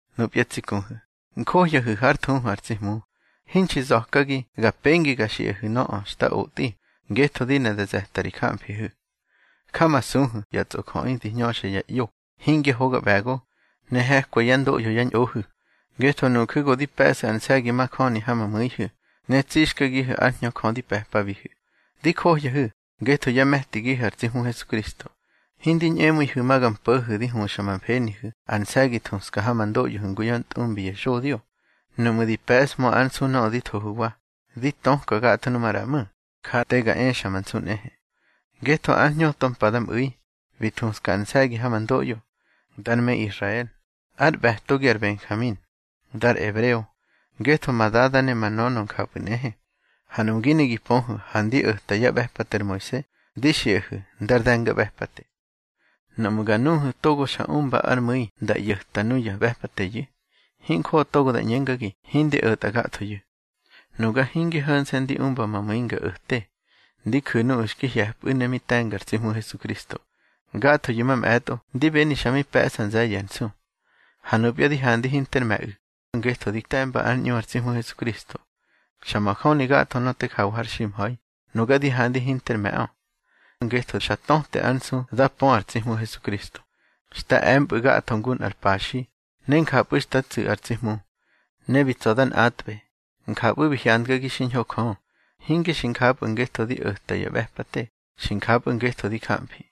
Nupya tsi kuhu̱, njohyahu̱ hár thuhu ar tsi Hmu. Hinxi za̱kagi ga pengi ga xiꞌahu̱ nöꞌö xta otꞌi, ngetho di ne da ze̱ta ri jamfihu̱. Jamasuhu̱ ya tsꞌojöꞌi di hñöxa ya ꞌyo, hingya hoga ꞌbe̱go, ne he̱kwa yá ndoꞌyo yá ñꞌohu̱. Ngetho nuju̱ go di pe̱ꞌsu̱ ar nse̱gi majöni ha ma mu̱ihu̱, ne tsixkagihu̱ ár Hñö Jö di pe̱pabihu̱. Di johyahu̱ ngetho yá me̱tigihu̱ ar tsi Hmu Hesukristo. Hindi ñꞌemu̱ihu̱ ma ga mpo̱hu̱ di huxa ma mfenihu̱ ar nse̱gi thuska ha ma ndoꞌyohu̱ ngu yá ntꞌumbi ya xodyo. Nuꞌmu̱ di pe̱ꞌshmö ár nsu nöꞌö di thohu̱wa, di töka gatho numaꞌra ꞌmu̱, ja te ga exa ma nsu nꞌehe. Ngetho ár hñöto mpa nda mꞌu̱i, bi thuska ar nse̱gi ha ma ndoꞌyo. Dar me Israel, ár ꞌbe̱togi ar Benjamin. Dar ebreo, ngetho ma dada ne ma nönö njapꞌu̱ nꞌehe. Ha nuꞌmu̱ gi ne gi pöhu̱ ha ndi o̱ta yá ꞌbe̱pate ar Moise, di xiꞌahu̱ ndar de̱ngaꞌbe̱pate. Nuꞌmu̱ ga nuhu̱ togo xa umba ár mu̱i nda ꞌyo̱ta nuya ꞌbe̱pateyu̱, hinjoꞌo togo da ꞌñengagi hindi o̱tꞌa gathoyu̱. Nuga hinge ho̱nse̱ ndi umba ma mu̱i nga o̱te, ndi ju̱ nuꞌu̱ xki hye̱pꞌu̱ ne mi te̱nga ar tsi Hmu Hesukristo. Gathoyu̱ mamꞌe̱tꞌo ndi beni xa mi pe̱ꞌsa nze̱ye̱ ar nsu. Ha nupya di handi hinter me̱ꞌu̱, ngetho di te̱mba ár ꞌñu ar tsi Hmu Hesukristo. Xa majöni gatho nöꞌö te jawa har ximha̱i, nuga di handi hinter me̱ꞌö, ngetho xa töte ár nsu da pö ar tsi Hmu Hesukristo. Xta e̱mpꞌu̱ gatho ngu nꞌar paxi, ne njapꞌu̱ xta tsu̱ ar tsi Hmu. Ne bi tsa̱ da nꞌatꞌbe, njapꞌu̱ bi hyandgagi xiñho Jö. Hinge xi njapꞌu̱ ngetho di o̱ta ya ꞌbe̱pate, xi njapꞌu̱ ngetho di jamfi.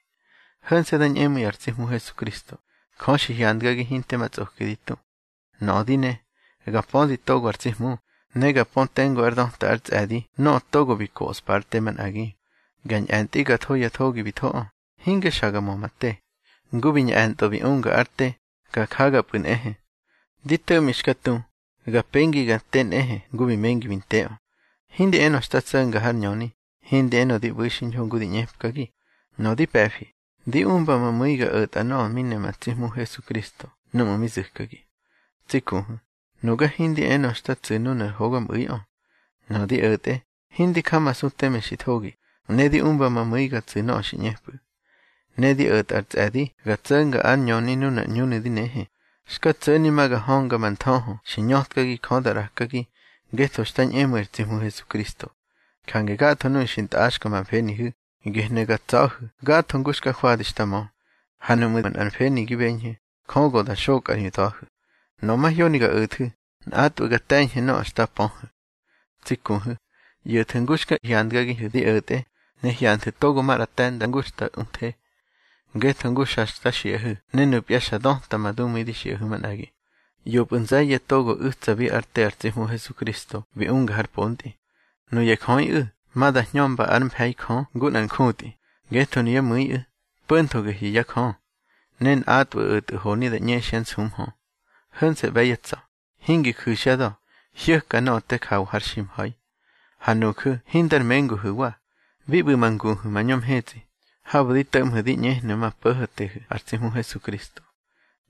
Ho̱nse̱ da ñꞌemu̱i ar tsi Hmu Hesukristo, Jö xi hyandgagi hinte ma tsꞌoki di tu. Nöꞌö di ne, ga pödi togo ar tsi Hmu, ne ga pö tengu ár döta ár tsꞌe̱di nöꞌö togo bi koꞌspa ár te manꞌagi. Ga ñꞌe̱ntꞌi ga tho ya thogi bi thoꞌö, hinge xa ga mö ma te. Ngu bi ñꞌe̱ntꞌö bi unga ár te, ga jagapꞌu̱ nꞌehe. Di to̱ꞌmi xka tu, ga pengi ga nte nꞌehe ngu bi mengi bi nteꞌö. Hindi enö xta tso̱nga har ñöni, hindi enö di ꞌbu̱i xiñho ngu di ꞌñepkagi. Nöꞌö di pe̱fi, di umba ma mu̱i ga o̱tꞌa nöꞌö mi ne ma tsi Hmu Hesukristo núꞌmu̱ mi zu̱kagi. Tsi kuhu̱, nuga hindi enö xta tsu̱ nunar hogamꞌu̱iꞌö. Nöꞌö di o̱tꞌe, hindi jamasu teme xi thogi, ne di umba ma mu̱i ga tsu̱ nöꞌö xi ꞌñepꞌu̱. Ne di o̱tꞌa ar tsꞌe̱di ga tso̱nga ár ñöni nunar ꞌñunu̱ di nehe. Xka tso̱ni ma ga hönga ma nthöhö xi ñötkagi Jö da ꞌrakagi ngetho xta ñꞌemu̱i ar tsi Hmu Hesukristo. Jange gatho nuꞌu̱ xi ntꞌaxka ma mfenihu̱, gehnu̱ ga tsa̱hu̱ gatho ngu xta jwadi xta mö. Ha nuꞌmu̱ manꞌar mfeni gi beñhu̱, Jö go da xokꞌa ri da̱hu̱. Nöꞌö mahyoni ga o̱thu̱, nꞌatꞌwu̱ ga te̱ñhu̱ nöꞌö xta pöhu̱. Tsi kuhu̱, ꞌyo̱thu̱ ngu xka hyandgagihu̱ di o̱tꞌe, ne hyanthu̱ togo maꞌra te̱nda ngu xta uthe. Ngetho ngu xa xta xiꞌahu̱ ne nupya xa döta ma dumu̱i di xiꞌahu̱ manꞌagi, ꞌyopꞌu̱ nze̱ye̱ togo u̱tsabi ár te ar tsi Hmu Hesukristo bi unga har pontꞌi. Nuya jöꞌiꞌu̱ ma da hñömba ár mfe̱i Jö ngu nꞌar njutꞌi, ngetho nuyá mu̱iꞌu̱, po̱ntho gehnu̱ yá jö. Ne nꞌatꞌwu̱ o̱tꞌu̱ honi da ꞌñexyá nsumhö. Ho̱nse̱ ꞌbe̱ yá tsa̱, hingi ju̱xyá da̱, hyo̱ka nöꞌö te jawa har ximha̱i. Ha nuju̱ hindar menguhu̱wa. Bi ꞌbu̱ ma nguhu̱ mañö mhetsꞌi, habu̱ di to̱ꞌmhu̱ di ꞌñehnu̱ ma Po̱ho̱tehu̱ ar tsi Hmu Hesukristo.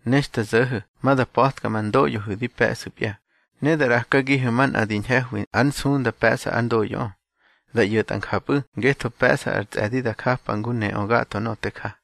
Ne xta zo̱ho̱ ma da pa̱tka ma ndoꞌyohu̱ di pe̱ꞌsu̱pya, ne da ꞌrakagihu̱ manꞌa di ñhe̱hwi ár nsunda pe̱ꞌsa ár ndoꞌyoꞌö. Da ꞌyo̱tꞌa njapꞌu̱ ngetho pe̱ꞌsa ar tsꞌe̱di da japa ngu neꞌö gatho nöꞌö te ja.